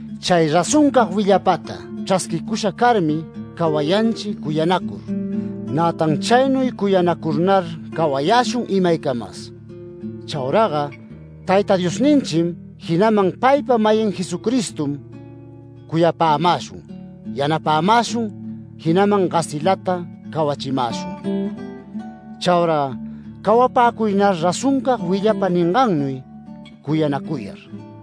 Chay razoncag willapata chrasquicusha carmi cawayanchi cuyanacur, nätan chaynuy cuyanacurnar cawayäshun imaycamas. Chauraga Tayta Diosninchim, jinaman paypa-mayin Jesucristom, cuyapämäshun yanapämäshun, jinaman gasilata cawachimäshun. Chaura cawapäcuynar razoncag willapa ningannuy cuyanacuyar.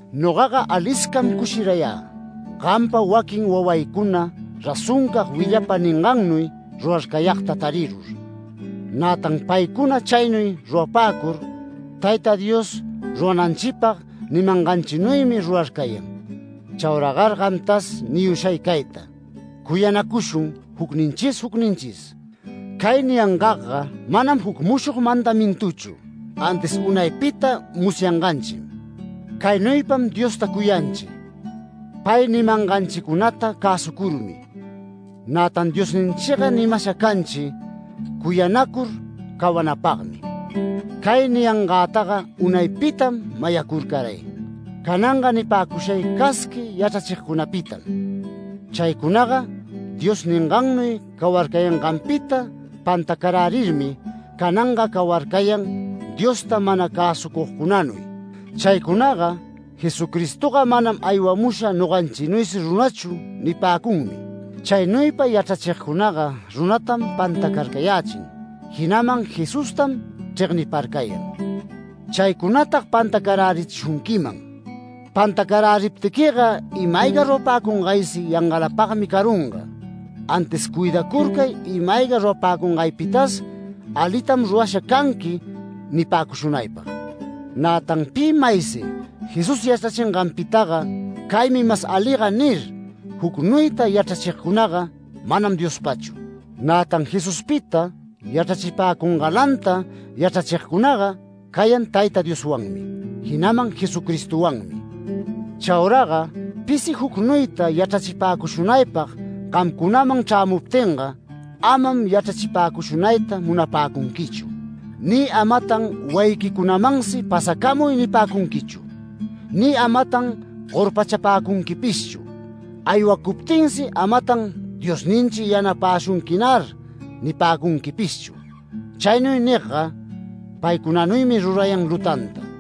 Nogaga aliscam cushirayä, gampa waquin wawaycuna razoncag willapa ningannuy rurarcayagta tarirur, nätan paycuna chaynuy rurapäcur Tayta Dios rurananchipag nimanganchinuymi rurarcayan. Chauragar gamtas niyushay cayta: Cuyanacushun jucninchis jucninchis. Cay niyangagga manam juc mushog mandamintuchu, antis unaypita musyanganchim. Caynuypam Diosta cuyanchi, pay nimanganchicunata cäsucurmi. Nätan Diosninchiga nimasha canchi, cuyanacur cawanapagmi. Cay niyangätaga unaypitam mayacurcaray. Cananga nipäcushay casqui yachrachigcunapitam. Chaycunaga Dios ningannuy cawarcayanganpita pantacarärirmi cananga cawarcayan Diosta mana cäsucugcunanuy. Chaycunaga “Jesucristoga manam aywamusha noganchinuysi runachu” nipäcunmi. Chaynuypa yachrachigcunaga runatam pantacarcayächin, jinaman Jesustam chregniparcayan. Chaycunatag pantacarärichishunquiman. Pantacaräriptiquiga ima-ayga rurapäcungaysi yangalapagmi carunga, antis cuidacurcay ima-ayga rurapäcungaypitas alitam rurasha canqui nipäcushunaypag. Nätan pi maysi Jesús yachrachinganpitaga “Caymi mas aliga” nir, jucnuyta yachrachigcunaga manam Diospachu. Nätan Jesuspita yachrachipäcungalanta yachrachigcunaga cayan Tayta Dioswanmi, jinaman Jesucristowanmi. Chauraga pisi jucnuyta yachrachipäcushunaypag gamcunaman chrämuptinga, amam yachrachipäcushunayta munapäcunquichu, ni amatan wayiquicunamansi “Pasacamuy” nipäcunquichu, ni amatan gorpachapäcunquipishchu, aywacuptinsi amatan “Diosninchi yanapäshunquinar” nipäcunquipishchu. Chaynuy nigga paycunanuymi rurayan lutanta.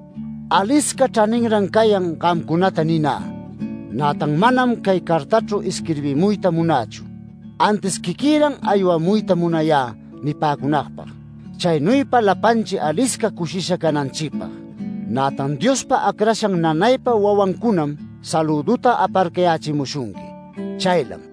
Alisca chraninran cayan gamcunata ninä, nätan manam cay cartachru isquirbimuyta munächu. Antis quiquïran aywamuyta munayä nipäcunagpag, chaynuypa lapanchi alisca cushisha cananchipag. Nätan Diospa acrashan nanaypa wawancunam salüduta aparcayächimushunqui. Chaylam.